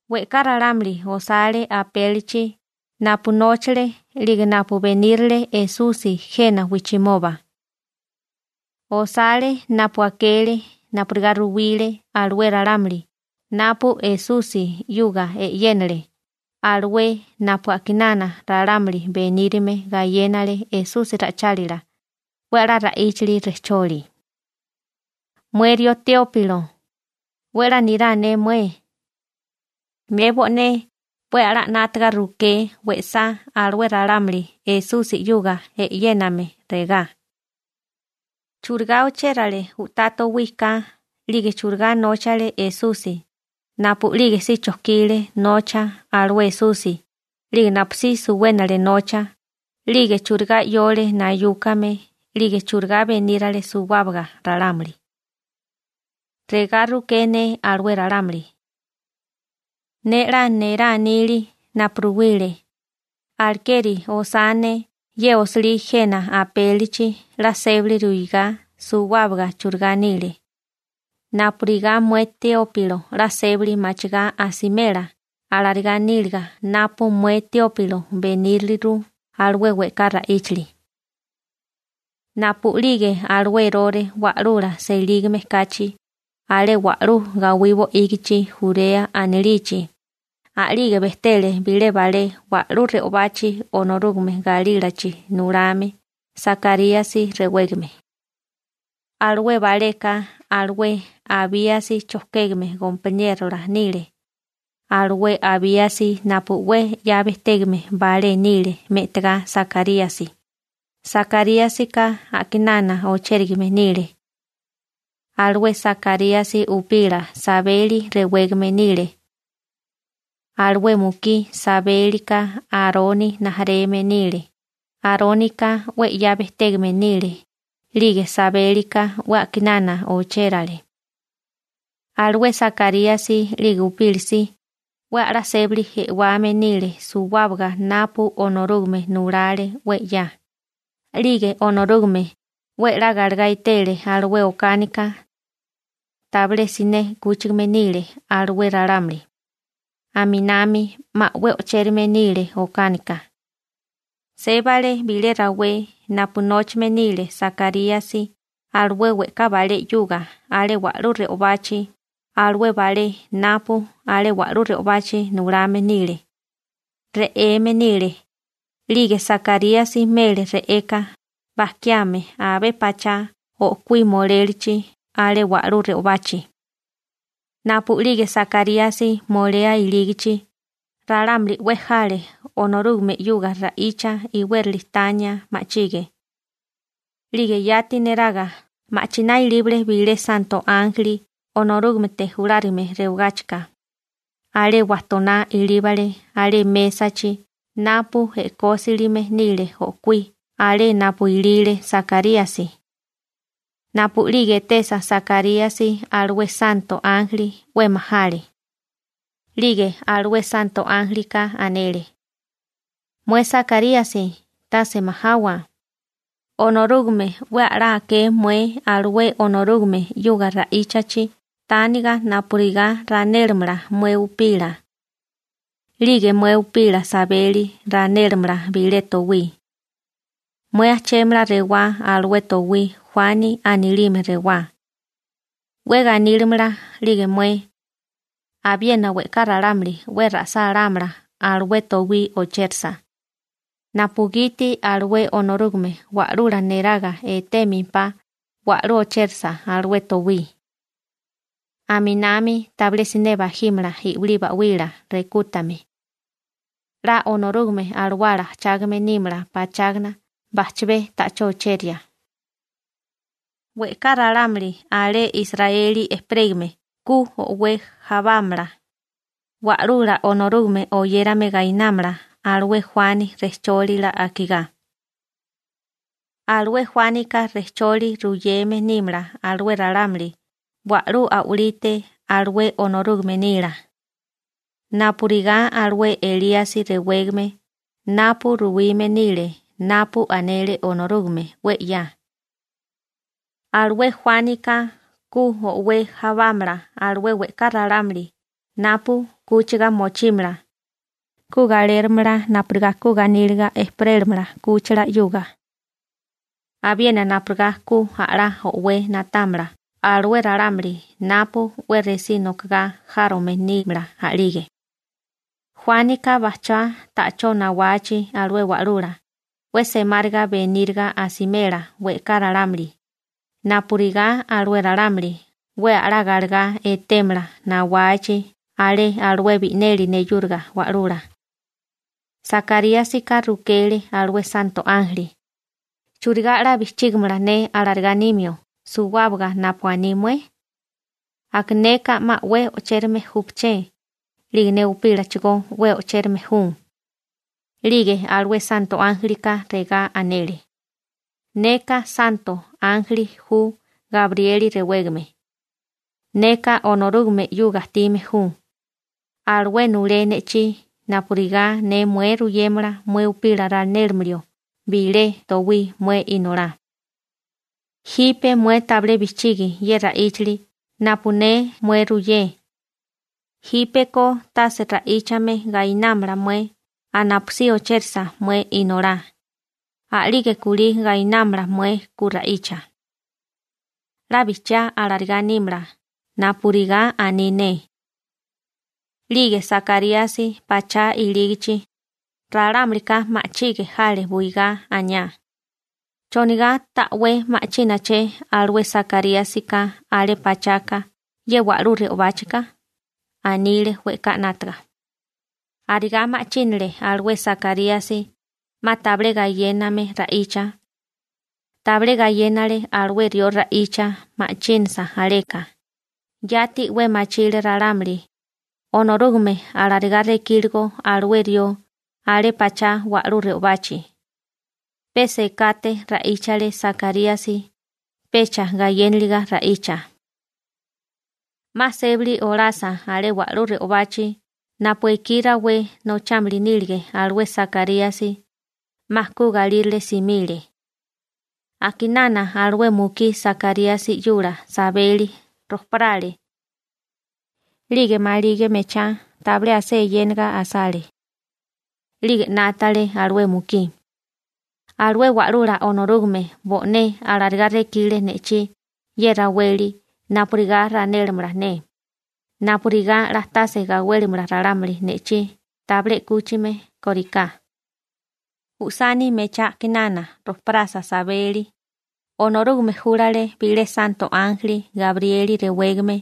We'ká ralámuli osale apélichi napu nóchale 'lige napu benírale Esusi jena wijchimoba. Osale napu akele napurigá ruwile alué ralámuli napu Esusi 'yuga e'yénale alué napu a'kinana ralámuli benírime gayénale Esusi ra'ichálila 'we a'lá ra'íchali rejcholi. Mué rió Teópilo, 'we 'la nirá ne mué. Ne bo'né 'we a'lá 'nátaga ruké we'sá alué ralámuli Esusi 'yuga e'yéname regá: «¿Churigá ochérale u'tá towí ka 'lige churigá nóchale Esusi napu'lige si chojkile nocha alué Esusi 'lige napusí suwénale nocha 'lige churigá 'yole nayúkame 'lige churigá benírale suwábaga ralámuli?» Regá ruké ne alué ralámuli. Ne 'la nerá nili napu ruwile, alekeri osá ne ye osilí jena apélichi 'la sébili ruigá suwábaga churigá nile, napurigá mué Teópilo 'la sébali machigá asimela alarigá níliga napu mué Teópilo beníriliru alué we'ká ra'íchali. Napu'lige alué Erore wa'lula selígame kachi alé alué wa'lú gawí bo'ígichi Jurea anilichi, a'lige bejtele bilé balé wa'lú re'obachi Onorúgame galílachi nulame Sakaríasi rewégame. Alué baleka alué Abíasi chojkégame gompaniérola nile, alué Abíasi napu 'we 'ya bejtégame balé nile me'tagá Sakaríasi, Sakaríasika a'kinana ochérigame nile. Alué Sakaríasi upila Sabeli rewégame nile. Alué mukí Sabélika Aroni rijimala nile, Arónika 'we 'ya bejtégame nile 'lige Sabélika 'we a'kinana ochérale. Alué Sakaríasi 'lige upila si 'we a'lá sébali e'wame nile suwábaga napu Onorúgame nulale 'we 'ya, 'lige Onorúgame 'we a'lá galegá etele alué okánika. Tabilé siné 'kúchigame nile alué ralámuli. Aminami 'ma 'we o'chérame nile okánika. Sébale bilé rawé napu nóchame nile Sakaríasi alué we'ká balé 'yuga alé wa'lú re'obachi alué balé napu alé wa'lú re'obachi nulame nile. Re'eme nile, 'lige Sakaríasi mele re'eka bajkiame abé pachá o'kuí molélachi alé wa'lú re'obachi. Napu'lige Sakaríasi molea ilígachi, ralámuli 'we jale Onorúgame 'yuga ra'icha iwérali tania ma'chige. 'Lige yati neraga ma'chiná ilíbale bilé santo ánjeli Onorúgamete julárigame rewagáchika, alé wajtoná ilíbale alé mésachi napu e'kósilime nile o'kuí alé napu ilile Sakaríasi. Napu'lige etesa Sakaríasi alué santo ánjeli, 'we majale. 'Lige alué santo ánjelika anele: ―Mué Sakaríasi, tase majawa. Onorúgame 'we a'lá aké mué alué Onorúgame 'yuga ra'íchachi tániga napurigá ranélamala mué upila. 'Lige mué upila Sabeli ranélamala bilé towí. Mué ajchémala rewá alué towí «Juani» anilime rewá. 'We ganílimala 'lige mué. Abiena we'ká ralámuli 'we ra'sálámala alué towí ochérasa, napugiti alué Onorúgame Wa'lula neraga etémempá wa'lú ochérasa alué towí. Aminami tabilé siné bajímala i'wilí ('uba) ba'wila rekútame. 'La Onorúgame Alawala ajchágame nímala pachágana bajchabé ta'chó ocheria. We'ká ralámuli alé Israeli ejperégame ku o'wé jábamala, Wa'lula Onorúgame oyérame gainámala alué Juani rejchólila akigá. Alué Juánika rejcholi ruyeme nímala alué ralámuli wa'lú a'walite alué Onorúgame nila, napurigá alué Elíasi rewégame napu ruwime nile napu anele Onorúgame 'we 'ya. Alué Juánika ku o'wé jawámala alué we'ká ralámuli napu 'kúchiga mochímala, ku ge'láramala napurigá ku ganíliga ejperélamala 'kúchila 'yuga, abiena napurigá ku a'lá o'wé na'támala alué ralámuli napu 'we resí nokagá járome nímala a'lige. Juánika bajchá ta'chó nawachi alué Wa'lula, 'we semáriga beníriga asimela we'ká ralámuli, napurigá alué ralámuli 'we a'lá galegá etémala nawachi alé alué bi'neli neyúriga Wa'lula. Sakaríasika rukele alué santo ánjeli: ―¿Churigá 'la bijchígamala ne alarigá nimio suwábaga napu aní mué? Aka neka 'ma 'we o'chérame júpaché, 'lige ne upílachigó 'we o'chérame ju. 'Lige alué santo ánjelika regá anele: ―Neka santo ánjeli ju Gabrieli rewégame. Neka Onorúgame 'yuga ajtime ju. Alué nulé ne'chí napurigá ne mué ruyémala mué upila ranélimio bilé towí mué inolá. Jipe mué tabilé bijchigi ye ra'íchali napu ne mué ruyé. Jípeko tase ra'íchame gainámala mué napusí ochérisa mué inolá, a'lige kulí gainámala mué ku ra'icha. 'La bijchiá alarigá nímala napurigá aní ne. 'Lige Sakaríasi pachá ilígichi, ralámulika ma'chige jale buigá, aniá: ―¿Chonigá ta'wé ma'chínaché alué Sakaríasika alé pachaka ye wa'lú re'obáchika? ―anile we'ká 'nátaga. Arigá ma'chínale alué Sakaríasi, 'ma tabilé gayéname ra'icha. Tabilé gayénale alué rió ra'icha ma'chínasa aleka, yati 'we machile ralámuli Onorúgame alarigá rekíligo alué rió alé pachá wa'lú re'obachi. Pe sekate ra'íchale Sakaríasi, pecha gayéniliga ra'icha. 'Ma sébali olasa alé wa'lú re'obachi napu ekí rawé nochámili nílige alué Sakaríasi, 'ma ku galírale simile. A'kinana alué mukí Sakaríasi 'yula Sabeli rojparale. 'Lige maligi mechá tabilé asé eyénaga asale. 'Lige 'nátale alué mukí: «Alué Wa'lula Onorúgame bo'né alarigá rekile ne'chí ye raweli napurigá ranélamala ne, napurigá 'la tase gawélimala ralámuli ne'chí tabilé 'kúchime kóriká.» Usani mechá a'kinana rojparasa Sabeli, Onorúgame júlale bilé santo ánjeli Gabrieli rewégame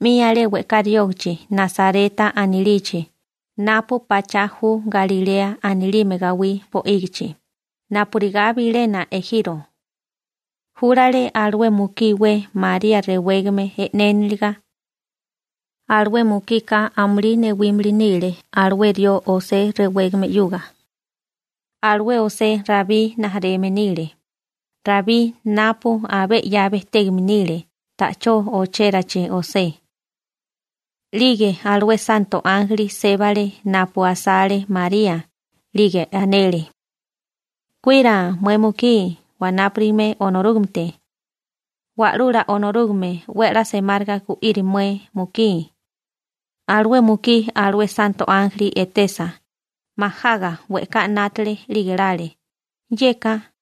'mi alé we'ká riógachi Nasareta anilichi napu pachá ju Galilea anilime gawí bo'ígichi napurigá bilena ejiro. Júlale alué mukí iwé María rewégame e'néniliga. Alué mukika amulí newímili nile alué rió José rewégame 'yuga. Alué José Rabí rijimala nile, Rabí napu abé 'ya bejtégame nile ta'chó ochérachi José. 'Lige alué santo ánjeli sébale napu asale María, 'lige anele: ―Kuira mué mukí wanápurigame Onorúgamete. Wa'lula Onorúgame 'we a'lá semáriga gu'iri mué mukí. Alué mukí alué santo ánjeli etesa, majaga we'ká 'nátale 'lige lale: «Yeka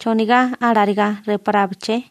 ¿chonigá alarigá reparábaché?»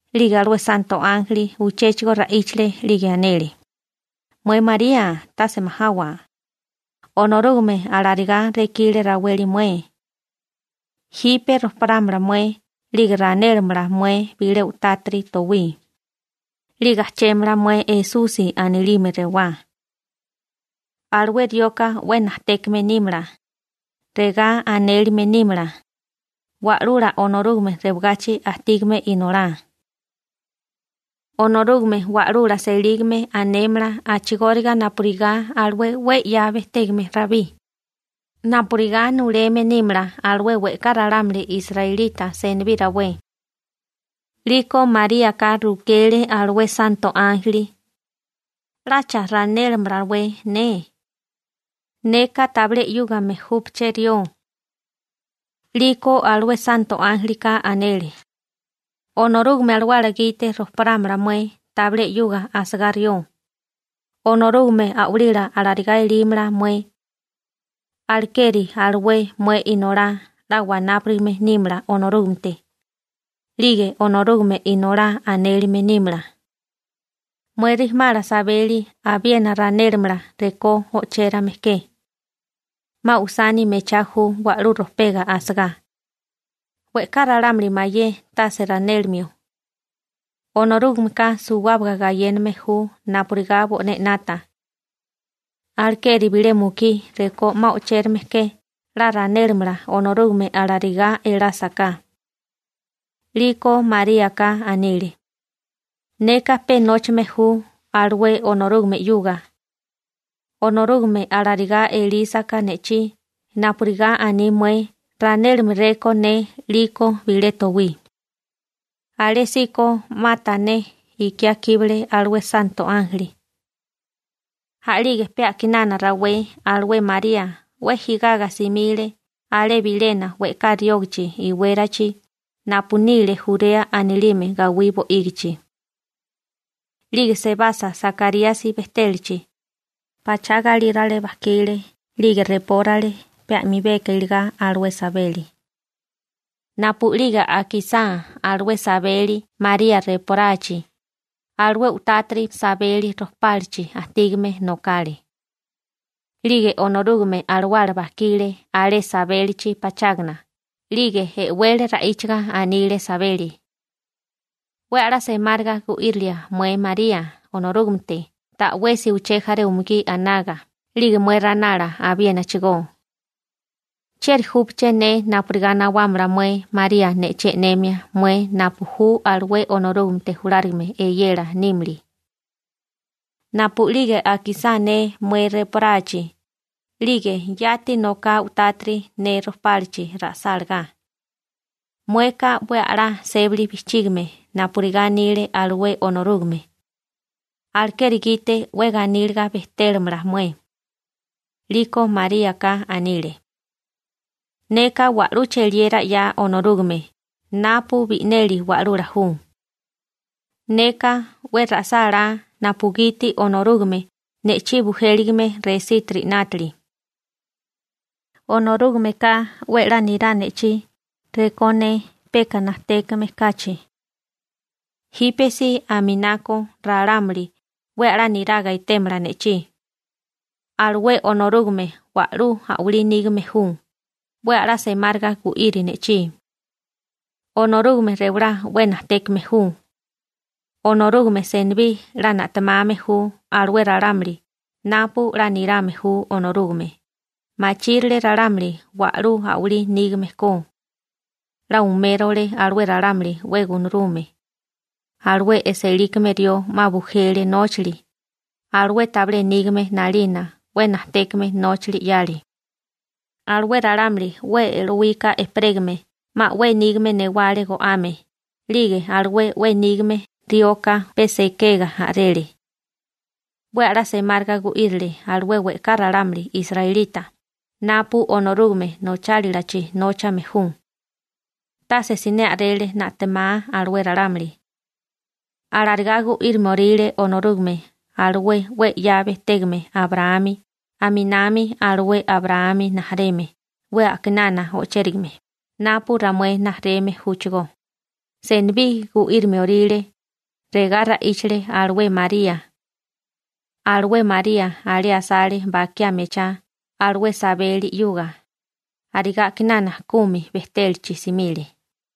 'Lige alué santo ánjeli uchéchigo ra'íchale, 'lige anele: ―Mué María tase majawa. Onorúgame alarigá rekile raweli mué. Jipe rojparámala mué 'lige ranélamala mué bilé u'tátiri towí. 'Lige ajchémala mué Esusi anilime rewá. Alué rioka 'we najtékame nímala. Regá anélime nímala «Wa'lula Onorúgame Rewagachi Ajtígame Inolá.» Onorúgame Wa'lula selígame anémala a'chigóriga napurigá alué 'we 'ya bejtégame Rabí, napurigá nuleme nímala alué we'ká ralámuli israelita senibí rawé. 'Liko Maríaka rukele alué santo ánjeli: ―¿'Lacha ranélamalawé ne? Neka tabilé 'yúgame júpaché rió. 'Liko alué santo ánjelika anele: ―Onorúgame Alawala gite rojparámala mué tabilé 'yuga asagá rió, Onorúgame a'walila alarigá elímala mué. Alekeri alué mué inolá 'la wanáparigame nímala Onorúgamete, 'lige Onorúgame Inolá anélime nímala. Mué rijimala Sabeli abiena ranélamala rekó o'chérame ke. 'Ma usani mechá ju wa'lú rojpega asagá. We'ká ralámuli mayé tase ranélimio. Onorúgameka suwábaga gayéname ju napurigá bo'né 'nata. Alekeri bilé mukí rekó 'ma o'chérame ke 'la ranélamala Onorúgame alarigá elásaká. 'Liko Maríaka anile: ―Neka pe nóchame ju alué Onorúgame 'yuga. Onorúgame alarigá elísaká ne'chí napurigá aní mué ranélamaréko ne 'liko bilé towí. Alésíko 'ma tané ikiá kíbale alué santo ánjeli. A'lige pe a'kinana rawé alué María 'we jigaga simile alé bilena we'ká riógachi iwérachi napu nile Jurea anilime gawí bo'ígichi. 'Lige sebasa Sakaríasi bejtélachi, pachá galírale bajkile 'lige repórale pe a'bemi iligá alué Sabeli. Napu'lige akisá alué Sabeli María reporachi, alué u'tátiri Sabeli rojpálachi ajtígame nokale. 'Lige Onorúgame Alawala bajkile alué Sabélichi pachágana 'lige e'wele ra'íchaga anile Sabeli: ―'We a'lá semáriga gu'írilia mué María Onorúgamete ta'wesi uché jaré umugí anaga 'lige mué ranala abiénachigó. ¿Chieri júpaché ne napurigá nawámala mué María ne'chí e'nemia mué napu ju alué Onorúgamete julárigame eyela nímili? Napu'lige akisá ne mué reporachi, 'lige yati noká u'tátiri ne rojpálachi ra'sálagá. Mueka 'we a'lá sébali bijchígime napurigá anile alué Onorúgame. Alekeri gite 'we ganíliga bejtélamala mué. 'Liko Maríaka anile: Neka wa'lú cheliera 'ya Onorúgame napu bi'neli Wa'lula ju. Neka 'we ra'sálá napugiti Onorúgame ne'chí bujéligame resítiri 'nátili. Onorúgameka 'we 'la nirá ne'chí rekó ne peka najtékame kachi. Jípesí aminako ralámuli 'we a'lá niraga etémala ne'chí. Alué Onorúgame wa'lú a'walí nígame ju, 'we a'lá semáriga gu'iri ne'chí. Onorúgame rewalá 'we najtékame ju. Onorúgame senibí 'la na'temame ju alué ralámuli napu 'la nirame ju Onorúgame, machírile ralámuli wa'lú a'walí nígame ko. 'La umérole alué ralámuli 'we gunarume. Alué e'sélikame rió 'ma bujele nóchali, alué tabilé nígame 'nalina 'we najtékame nóchali 'yale. Alué ralámuli 'we e'lowika ejperégame 'ma 'we nígame newale go'ame, 'lige alué 'we nígame rioka pe sekega a'rele. 'We a'lá semáriga gu'írile alué we'ká ralámuli israelita napu Onorúgame nochálilachi nóchame ju. Tase siné a'rele na'temá alué ralámuli. Alarigá gu'írimioríle Onorúgame alué 'we 'ya bejtégame Abraámi aminami alué Abraámi rijimala 'we a'kinana o'chérigame napu ramué rijimala júchigó, senibí gu'írimioríle. Regá ra'íchale alué María. Alué María alé asale bakiá mechá alué Sabeli 'yuga, arigá a'kinana kumi bejtélachi simile.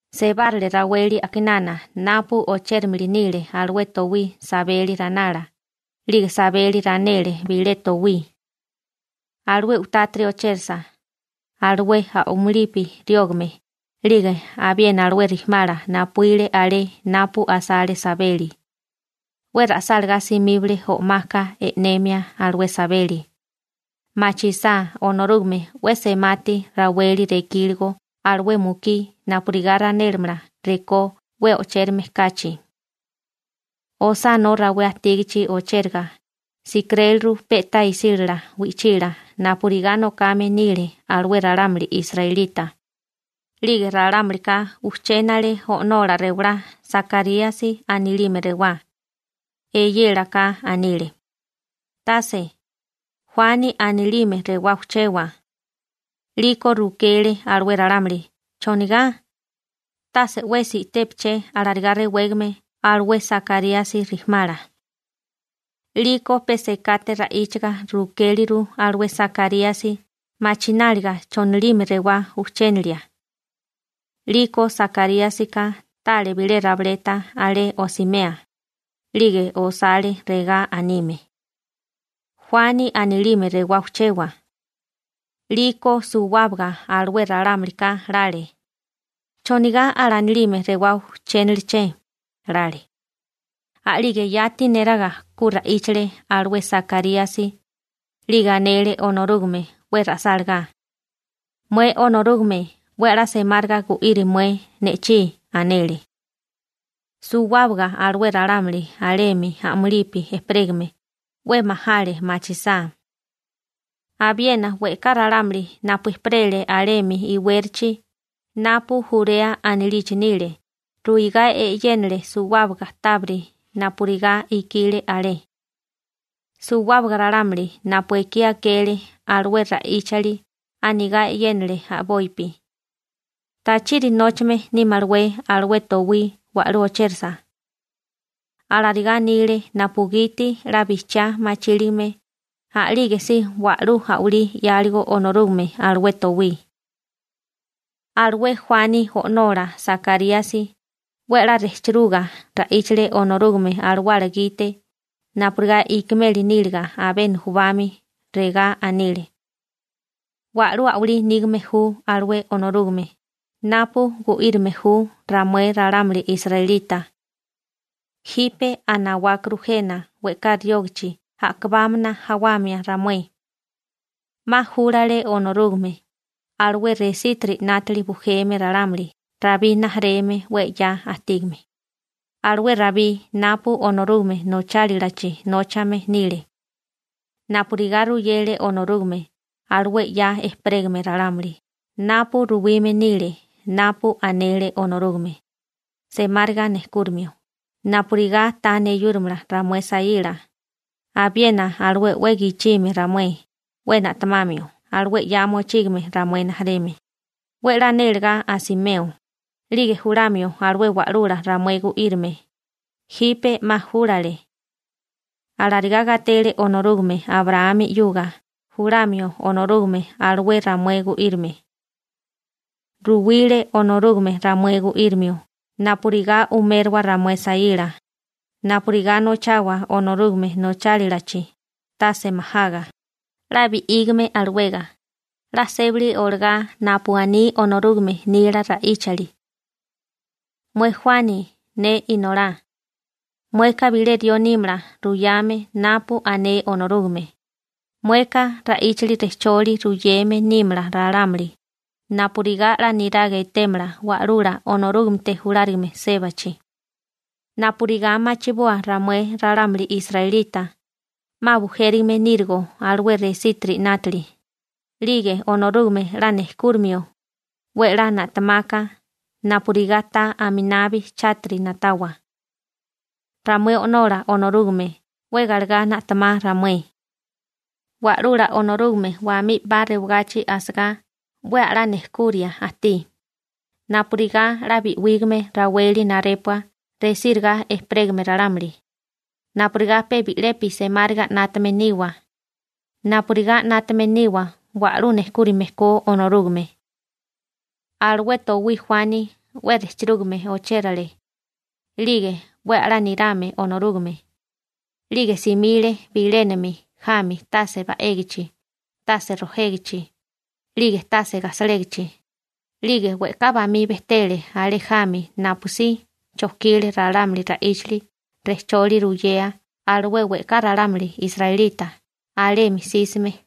Sebárale raweli a'kinana napu ochérimili nile alué towí Sabeli ranala, 'lige Sabeli ranele bilé towí. Alué u'tátiri ochérasa, alué a'mulipi riógame 'lige abiena alué rijimala napuíle alé napu asale Sabeli, 'we ra'sálagá simíbale o'maka e'nemia alué Sabeli, machisá Onorúgame 'we semati raweli rekíligo alué mukí napurigá ranélamala rekó 'we o'chérame kachi. Osánó rawé ajtígachi ochéraga, sikiréliru pe'tá isílala wi'chila napurigá nokame nile alué ralámuli israelita. 'Lige ralámulika ujchénale o'nola rewalá Sakaríasi anilime rewá. Eyélaka anile: ―Tase. Juani anilime rewá ujchewa. 'Liko rukele alué ralámuli: ―¿Chonigá? Tase 'wesi i'tépaché alarigá rewégame alué Sakaríasi rijimala. 'Liko pe sekate ra'íchaga rukéliru alué Sakaríasi machináliga chonilime rewá ujchénelia. 'Liko Sakaríasika tale bilé rabileta alé osimea, 'lige osale regá anime: «Juani anilime rewá ujchewa.» 'Liko suwábaga alué ralámulika lale: «¿Chonigá alanilime rewá ujchéneleché?» lale. A'lige yati neraga ku ra'íchale alué Sakaríasi, 'lige anele Onorúgame 'we ra'sálagá: ―Mué Onorúgame 'we a'lá semáriga gu'iri mué ne'chí ―anele. Suwábaga alué ralámuli alemi a'mulipi ejperégame 'we majale machisá. Abiena we'ká ralámuli napu ejperele alemi iwérachi napu Jurea anilichi nile ruigá e'yénale suwábaga tábiri napurigá ikile alé. Suwábaga ralámuli napu ekí akele alué ra'íchali anigá e'yénale a'bopi: ―¿Tachiri nóchame nímalawé alué towí wa'lú ochérasa? Alarigá anile napugiti 'la bijchiá machíligame a'lígesí wa'lú a'walí 'yáligo Onorúgame alué towí. Alué Juani o'nola Sakaríasi 'we a'lá rejcheruga ra'íchale Onorúgame Alawala gite napurigá ikimeli níliga abé nujubami, regá anile: Wa'lú a'walí nígame ju alué Onorúgame napu gu'írime ju ramué ralámuli israelita. Jipe 'a nawákuru jena we'ká riógachi a'kabámana jawamia ramué. 'Ma júlale Onorúgame alué resítiri 'nátili bujeme ralámuli Rabí rijimala 'we 'ya ajtígame, alué Rabí napu Onorúgame nochálilachi nóchame nile napurigá ruyele Onorúgame alué 'ya ejperégame ralámuli napu ruwime nile napu anele Onorúgame, semáriga nejkúrimio napurigá ta neyúrimala ramué saíla, abiena alué 'we gichime ramué, 'we na'temamio alué 'ya mochígame ramué rijimala, 'we 'la nélegá asimeo, 'lige julamio alué wa'lula ramué gu'írime, jipe 'ma júlale. Alarigá gatele Onorúgame Abraámi 'yuga julamio Onorúgame alué ramué gu'írime. Ruwile Onorúgame ramué gu'írimio napurigá umérowa ramué saíla, napurigá nochawa Onorúgame nochálilachi tase majaga, 'la bi'ígame alawega, 'la sébali olagá napu aní Onorúgame nila ra'íchali. Mué Juani, ne inolá, mueka bilé rió nímala ruyame napu ané Onorúgame. Mueka ra'íchali rejcholi ruyeme nímala ralámuli napurigá 'la niraga etémala Wa'lula Onorúgamete Julárigame sébachi, napurigá machiboa ramué ralámuli israelita 'ma bujérigame nírigo alué resiti 'nátili, 'lige Onorúgame 'la nejkúrimio 'we 'la na'temaka napurigá ta aminabi chátiri na'tawa. Ramué O'nola Onorúgame 'we galegá na'temá ramué. Wa'lula Onorúgame wamí 'paka rewagachi asagá 'we a'lá nejkuria ajtí napurigá 'la bi'wígame raweli narépua resíriga ejperégame ralámuli, napurigá pe bi'lepi semáriga 'nátame niwa, napurigá 'nátame niwa wa'lú nejkúrame ko Onorúgame. Alué towí Juani 'we rejchirúgame ochérale, 'lige 'we a'lá nirame Onorúgame, 'lige simile bilénami jami tase ba'égichi, tase rojégichi, 'lige tase gajsalégichi, 'lige we'ká bamí bejtele alé jami napusí chojkile ralámuli ra'íchali rejcholi ruyea alué we'ká ralámuli israelita alemi jsísime.